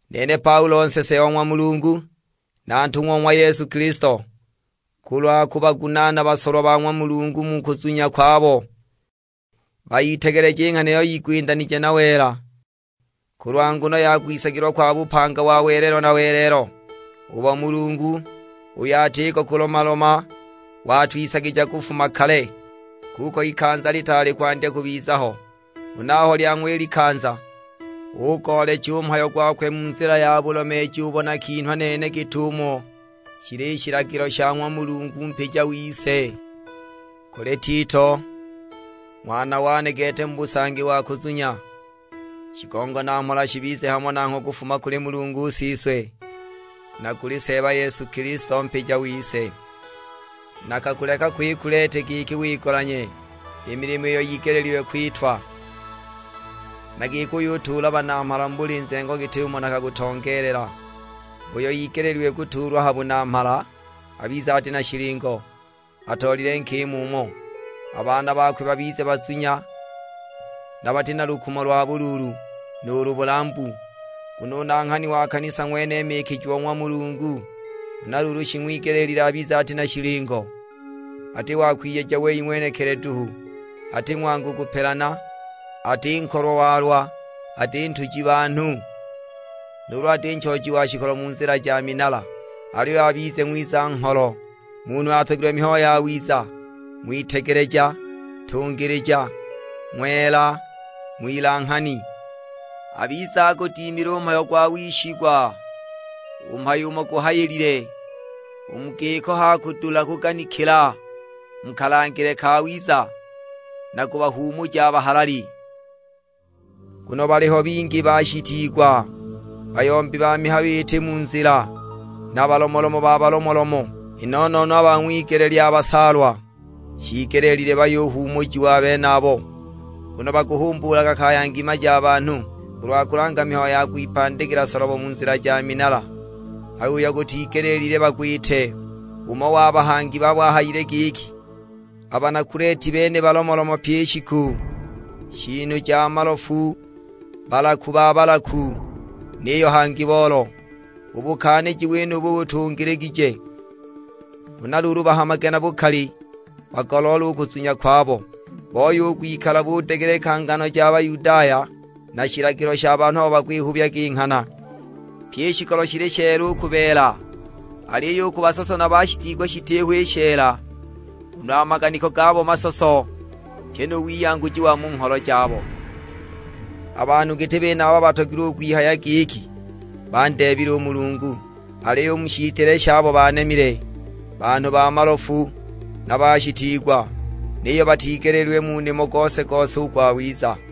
Nene Paulo nsese o ng'wa Mulungu, na ntung'wa o ng'wa Yesu Kilisto, kulwa kubagunaana basolwa ba ng'wa Mulungu mu kuzunya kwabo; bayitegeleje i nghana iyo yigwindanije na wela, kulwa nguno ya kwisagilwa kwa bupanga wa welelo na welelo, ubo Mulungu, uyo atiko kulomaloma, watwisagija kufuma kale, kuko ikanza litaali kwandya kubiza ho. Huna aho lyang'wa i likanza, ugoolecha u mhayo gokwe mu nzila ya bulomeeji ubo nakinhwa nene git'umo shili shilagilo sha ng'wa Mulungu mpija wise. Kuli Tito, ng'wana wane gete mu busangi wa kuzunya; shigongo na mhola shibize hamo nangho kufuma kuli Mulungu Siswe, na kuli Seeba Yesu Kilisto Mpija wise. Nakakuleka ko i Kuleti giki wigolanye i milimo iyo yigelile kwitwa, na giki uyutuula banamhala mu buli nzengo git'umo nakakutongeelela. Uyo igeleelilwe kutuulwa ha bunamhala abize ati na shilingo, atoolile nkima umo. A baana bakwe babize bazunya, na bati na lukumo lwa buluulu, nuulu bulambu. Nguno u nanghani wa kanisa ng'wene mikijiwa o ng'wa Mulungu, huna luulu shing'wigelile abize ati na shilingo, ati wa kwiyeja wei ng'wenekili duhu. Ati ng'wangu kupelana, ati nkolwa-walwa, ati ntuji banhu, nuulu ati nchooji wa shikolo mu nzila ja minala. Aliyo abize ng'wiza-ngholo, munhu uyo atogilwe mihayo yawiza, ng'witegeleja, ntungilija, ng'wela, ng'wilanghani. Abize agudimile mu wishigwa u mhayo umo guhayilile; u mu giko h'akudula kuganikila mu kalangile kawiza, na kubahuumuja a bahalali. Nguno baliho bingi a bashitiigwa, bayombi ba mihayo iti mu nzila, na balomolomo ba balomolomo; i no-no-no a ba ng'wigele lya basaalwa. Shiigelile bayuhuumujiwa a benabo, nguno bakuhumbuulaga kaya ngima ja banhu, kulwa kulanga mihayo ya kwipandikila solobo mu nzila ja minala, mhayo uyo gutigelile bagwite. Umo wa bahangi babo ahayile giki, "A bana Kuleti bene balomolomo pyi i shiku, shiinu ja malofu, balaku ba balaku, niyo hangi boolo!" U bukaaniji wenubu butungiligije. Huna luulu bahamage na bukali bagoloole u kuzunya kwabo. Booye u kwikala budegeleka ngano ja Bayudaya, na shilagilo sha banhu abo bakwihubyaga i nghana. Pye i shikolo shili sheela u ku beela, aliyo u ku basoso na bashitiigwa shitiho i sheela, nguno a maganiko gabo masoso, pyi nu wiyanguji wa mu ngholo jabo. A banhu giti benaba batogilwe u kwihaya giki bandeebile u Mulungu, aliyo u mu shitile shabo banemile. Banhu ba malofu na bashitiigwa, niyo batigeleelilwe mu nimo gose-gose u gwawiza!